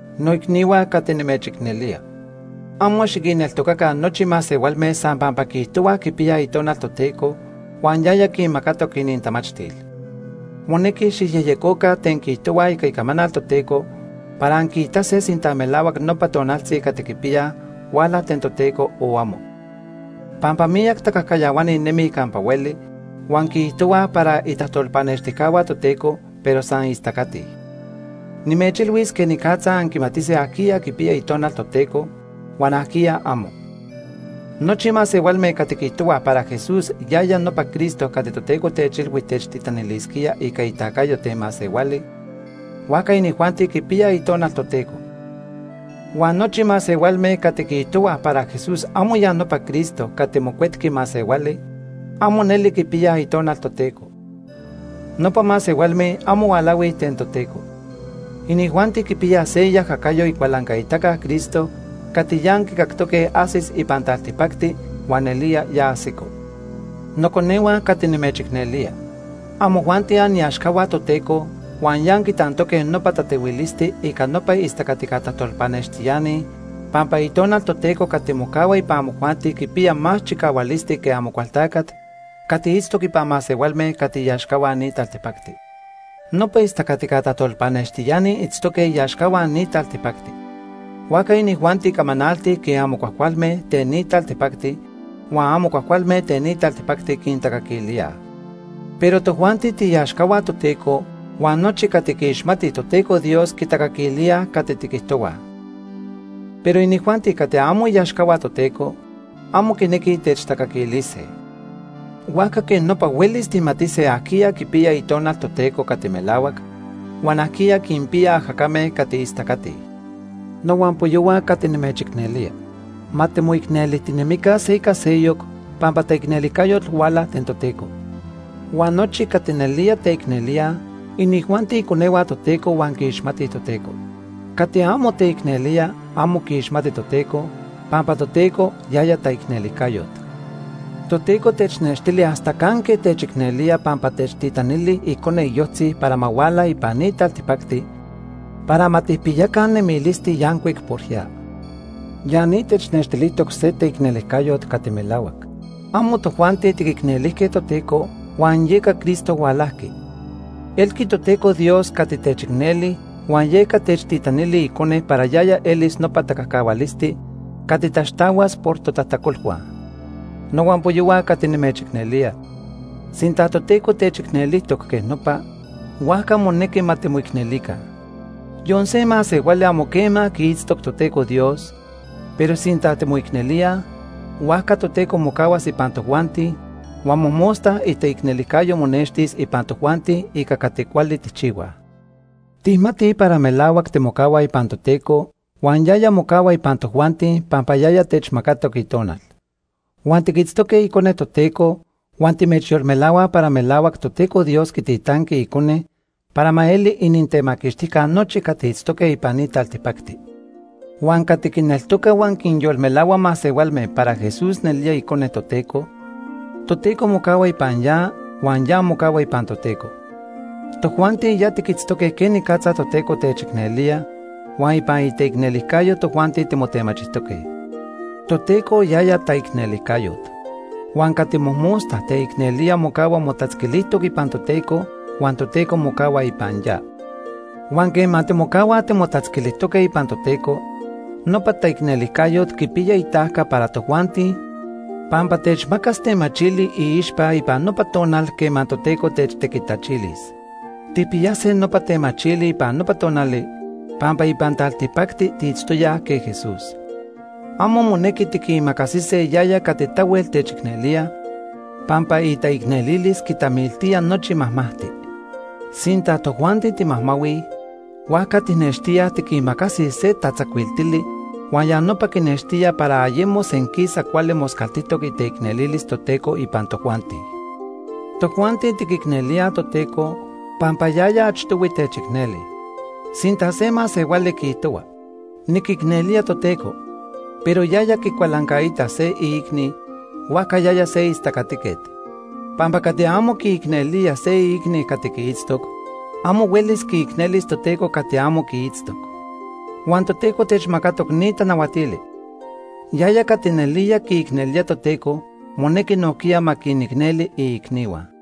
Noicnihua cati nimechicnelía. Amo xiquinneltocaca nochi masehualme san pampa quiijtohuaj quipiyaj Itonal Toteco huan yaya quinmacatoc inintamachtil. Monequi xijyejyecoca ten quiijtohuaj ica Icamanal Toteco para anquiitase sinta melahuac nopa tonaltzi cati quipiyaj huala ten Toteco, o amo. Pampa miyac tacajcayahuani nemij campa hueli, huan quiijtohuaj para itajtolpanextijcahua Toteco, pero san istacatij. Nimechilhuis quenicatza anquimatise ajquiya quipiya Itonal Toteco huan ajquiya amo. Nochi masehualme cati quiijtohuaj para Jesús yaya nopa Cristo cati Toteco techilhui techtitanilisquía ica itacayo ten masehuali, huajca inijuanti quipiyaj Itonal Toteco. Huan nochi masehualme cati quiijtohuaj para Jesús amo ya nopa Cristo cati mocuetqui masehuali, amo neli quipiyaj Itonal Toteco. Nopa masehualme amo hualahuij ten Toteco. Inijuanti quipiyaj se iajacayo Icualancaitaca Cristo cati ya anquicactoque ajsis ipan taltipacti huan nelía ya ajsico. Noconehua cati nimechicnelía, amojuanti aniaxcahua Toteco huan ya anquitantoque nopa tatehuilisti ica nopa istacatica tajtolpanextiani pampa Itonal Toteco cati mocahua ipan amojuanti quipiya más chicahualisti que Amocualtacat cati itztoc ipan masehualme cati iaxcahua ni taltipacti. Nopa istacatica tajtolpanextiani itztoque iaxcahua ni taltipacti. Huajca inijuanti camanaltij quej amo cuajcualme ten ni taltipacti, huan amo cuajcualme ten ni taltipacti quintacaquilíaj. Pero tojuanti tiiaxcahua Toteco, huan nochi cati quiixmatij Toteco Dios quitacaquilíaj cati tiquijtohuaj. Pero inijuanti cati amo iaxcahua Toteco, amo quinequij techtacaquilise. Huajca quej nopa huelis tijmatise ajquiya quipiya Itonal Toteco cati melahuac, huan ajquiya quinpiya ajacame cati istacatij. Nohuampoyohua cati nimechicnelía, ma timoicnelijtinemica se ica seyoc pampa taicnelijcayot huala ten Toteco. Huan nochi cati nelía teicnelíaj, inijuanti iconehua Toteco huan quiixmatij Toteco. Cati amo teicnelía amo quiixmati Toteco, pampa Toteco, yaya taicnelijcayot. Toteco technextili hasta canque techicnelía pampa techtitanili Icone iyojtzi para ma huala ipan ni taltipacti para ma tijpiyaca nemilisti yancuic por ya. Ya ni technextilijtoc se teicnelijcayot cati melahuac. Amo tojuanti tiquicnelijque Toteco huan yeca Cristo hualajqui. Elqui Toteco Dios cati techicneli huan yeca techtitanili Icone para yaya elis nopa tacajcahualisti cati taxtahuas por totajtacolhua. Nohuampoyohua cati nimechicnelía, sinta Toteco techicnelijtoc quej nopa, huajca monequi ma timoicnelica. Yon se masehuali amo quema quiitztoc Toteco Dios, pero sinta timoicnelíaj, huajca Toteco mocahuas ipan tojuanti huan mojmosta itaicnelijcayo monextis ipan tojuanti ica cati cuali tijchihuaj. Tijmatij para melahuac timocahuaj ipan Toteco huan yaya mocahua ipan tojuanti pampa yaya techmacatoc Itonal. Huan tiquitztoque Icone Toteco huan timechyolmelahuaj para melahuac Toteco Dios quititanqui Icone para ma eli inintemaquixtijca nochi cati itztoque ipan ni taltipacti. Huan cati quineltoca huan quinyolmelahua masehualme para Jesús nelía Icone Toteco, Toteco mocahua ipan ya huan ya mocahua ipan Toteco. Tojuanti ya tiquitztoque quenicatza Toteco techicnelía huan ipan iteicnelijcayo tojuanti timotemachijtoque. Toteco yaya taicnelijcayot. Huan cati mojmosta teicnelía mocahua motatzquilijtoc ipan Toteco huan Toteco mocahua ipan ya. Huan quema timocahuaj timotatzquilijtoque ipan Toteco, nopa taicnelijcayot quipiya itajca para tojuanti pampa techmacas temachili iixpa ipan nopa tonal quema Toteco techtequitachilis. Tijpiyase nopa temachili ipan nopa tonali pampa ipan taltipacti tiitztoyaj quej Jesús. Amo monequi tiquimacasise yaya cati tahuel techicnelía, pampa itaicnelilis quitamiltía nochi majmajti. Sinta tojuanti timajmahuij, huajca tijnextíaj tiquimacasij se tatzacuiltili huan ya nopa quinextía para ayemo senquisa cuali moscaltijtoc iteicnelilis Toteco ipan tojuanti. Tojuanti tiquicnelíaj Toteco, pampa yaya achtohui techicneli. Sinta se masehuali quiijtohua: “Niquicnelía Toteco”, pero yaya quicualancaita se iicni, huajca yaya se istacatiquet. Pampa cati amo quiicnelía se iicni cati quiitztoc, amo huelis quiicnelis Toteco cati amo quiitztoc. Huan Toteco techmacatoc ni tanahuatili: Yaya cati nelía quiicnelía Toteco, monequi nojquiya ma quinicneli iicnihua.